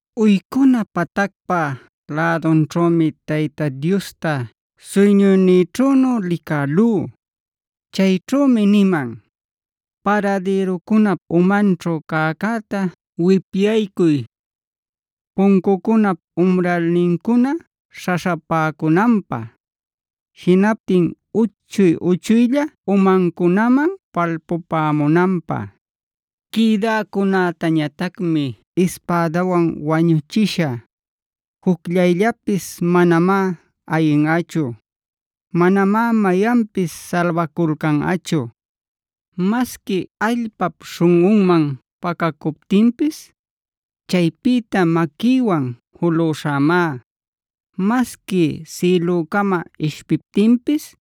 Uycuna patacpa lädunćhümi Tayta Diosta suyñuynïćhünu licälú. Chayćhümi niman: “Paradïrucunap umanćhu cäcäta wipyaycuy, puncucunap umralnincuna śhaśhapäcunanpä; jinaptin uchuy-uchuylla umancunaman palpupämunanpä. Quïdäcunätañatacmi ispädawan wañüchishä; jucllayllapis manamá ayinꞌachu; manamá mayanpis salbaculcanꞌachu. Masqui allpap śhunꞌunman pacacuptinpis, chaypïta maquïwan juluśhämá. Masqui sïlücama ishpiptinpis,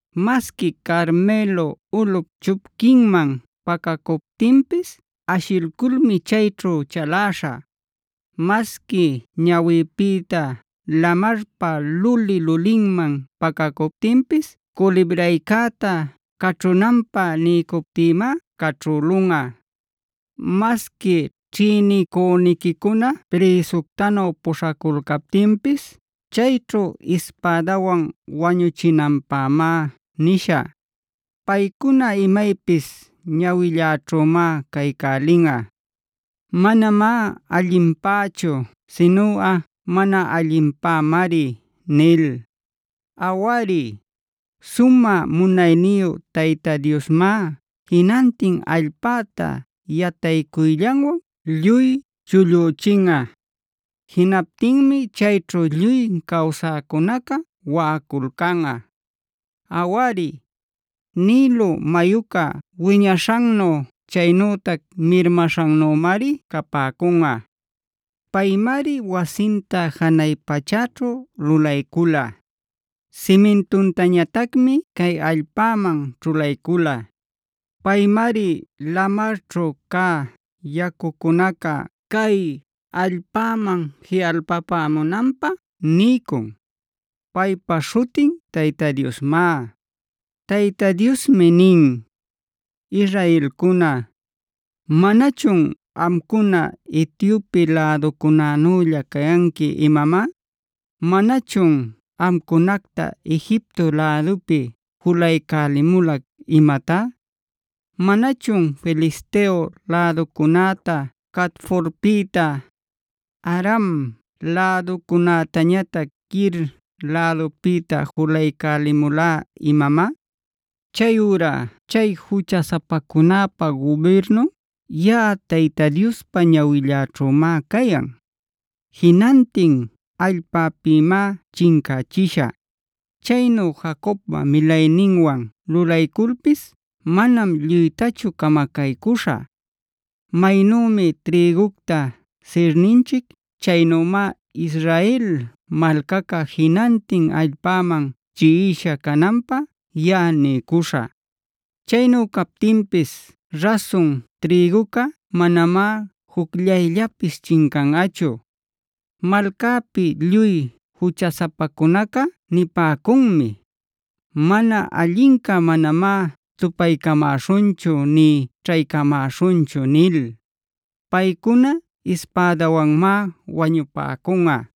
Masqui Carmelo ulꞌup chupquinman pacacuptinpis ashilculmi chayćhu chaläśhä. Masqui ñawïpïta lamarpa luli-lulïninman pacacuptinpis culibraycäta caćhünanpä niycuptïmá caćhülunꞌa. Masqui ćhïnicüniquicuna prïsuctanu puśhaculcaptinpis chayćhu ispädawan wañuchinanpämá nishä. Paycuna imaypis ñawilläćhümá caycälinꞌa; manamá allinpächu sinuꞌa mana allinpämari” nil. Awari, sumä munayniyu Tayta Diosmá jinantin allpäta yataycuyllanwan lluy chullüchinꞌa. Jinaptinmi chayćhu lluy cawsäcunaca waꞌaculcanꞌa. Awari, Nilo mayuca wiñaśhannu chaynütac mirmaśhannümari capäcunꞌa. Paymari wasinta janay pachäćhu lulaycula; simintuntañatacmi cay allpäman ćhulaycula. Paymari lamarćhu cä yacucunaca cay allpäman jiꞌalpapämunanpä niycun. Paypa śhutin Tayta Diosmá. Tayta Diosmi nin: “Israelcuna, ¿manachun amcuna Etiope läducunänülla cayanqui imamá? ¿Manachun amcunacta Egipto lädupi julaycälimulac imatá? ¿Manachun Filisteo läducunäta Caftorpïta, Aram läducunätañatac Kir lädupïta julaycälimulá imamá? “Chayurá chay juchasapacunäpa gubirnun yaꞌa Tayta Diospa ñawilläćhümá cayan. Jinantin allpäpïmá chincächishä. Chaynu Jacobpa milayninwan lulayculpis manam lluytachu camacaycüśhä. Maynümi trïgucta sirninchic chaynümá Israel malcaca jinantin allpäman chiꞌisha cananpä yaꞌa niycuśhä. Chaynu captinpis rasun trïguca manamá jucllayllapis chincanꞌachu. Malcäpi lluy juchasapacunaca nipäcunmi: ‘Mana allinca manamá tupaycamäśhunchu nï ćhaycamäśhunchu’ nil. Paycuna ispädawanmá wañupäcunꞌa.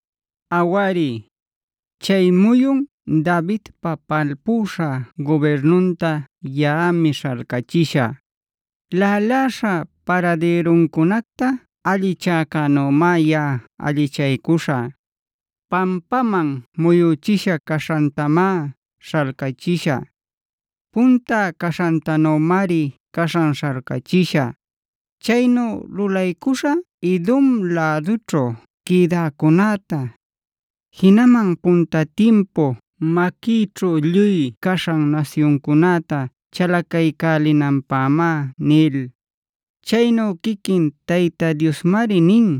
“Awari, chay muyun Davidpa palpüśha gubirnunta yaꞌami śhalcachishä. Laꞌaläśha paradïruncunacta allichäcänümá yaꞌa allichaycuśhä. Pampaman muyüchisha caśhantamá śhalcachishä. Punta caśhantanümari caśhan śhalcachishä. Chaynu lulaycuśhä Edomb lädućhu quïdäcunäta, jinaman punta timpu maquïćhu lluy caśhan nasyuncunäta chalacaycälinanpämá” nil. Chaynu quiquin Tayta Diosmari nin;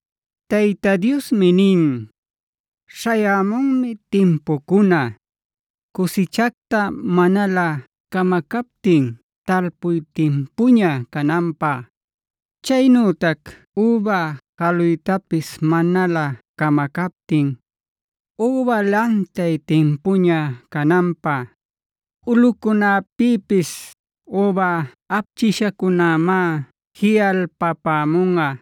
Tayta Diosmi nin: “Śhayämunmi timpucuna, cusichacta manalä camacaptin talpuy timpuña cananpä; chaynütac üba jaluytapis manalä camacaptin üba lantay timpuña cananpä. Ulꞌucunäpïpis üba apchïshacunamá jiꞌalpapämunꞌa;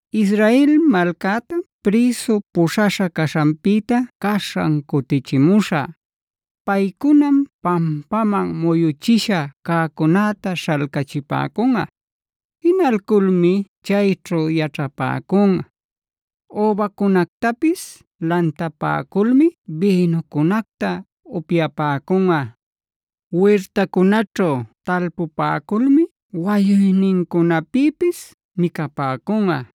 Israel malcätam prïsu puśhaśha caśhanpïta caśhan cutichimuśhä. Paycunam pampaman muyüchisha cäcunäta śhalcachipäcunꞌa. Jinalculmi chayćhu yaćhapäcunꞌa; übacunactapis lantapäculmi bïnuncunacta upyapäcunꞌa. Wirtacunaćhu talpupäculmi wayuynincunapïpis micapäcunꞌa.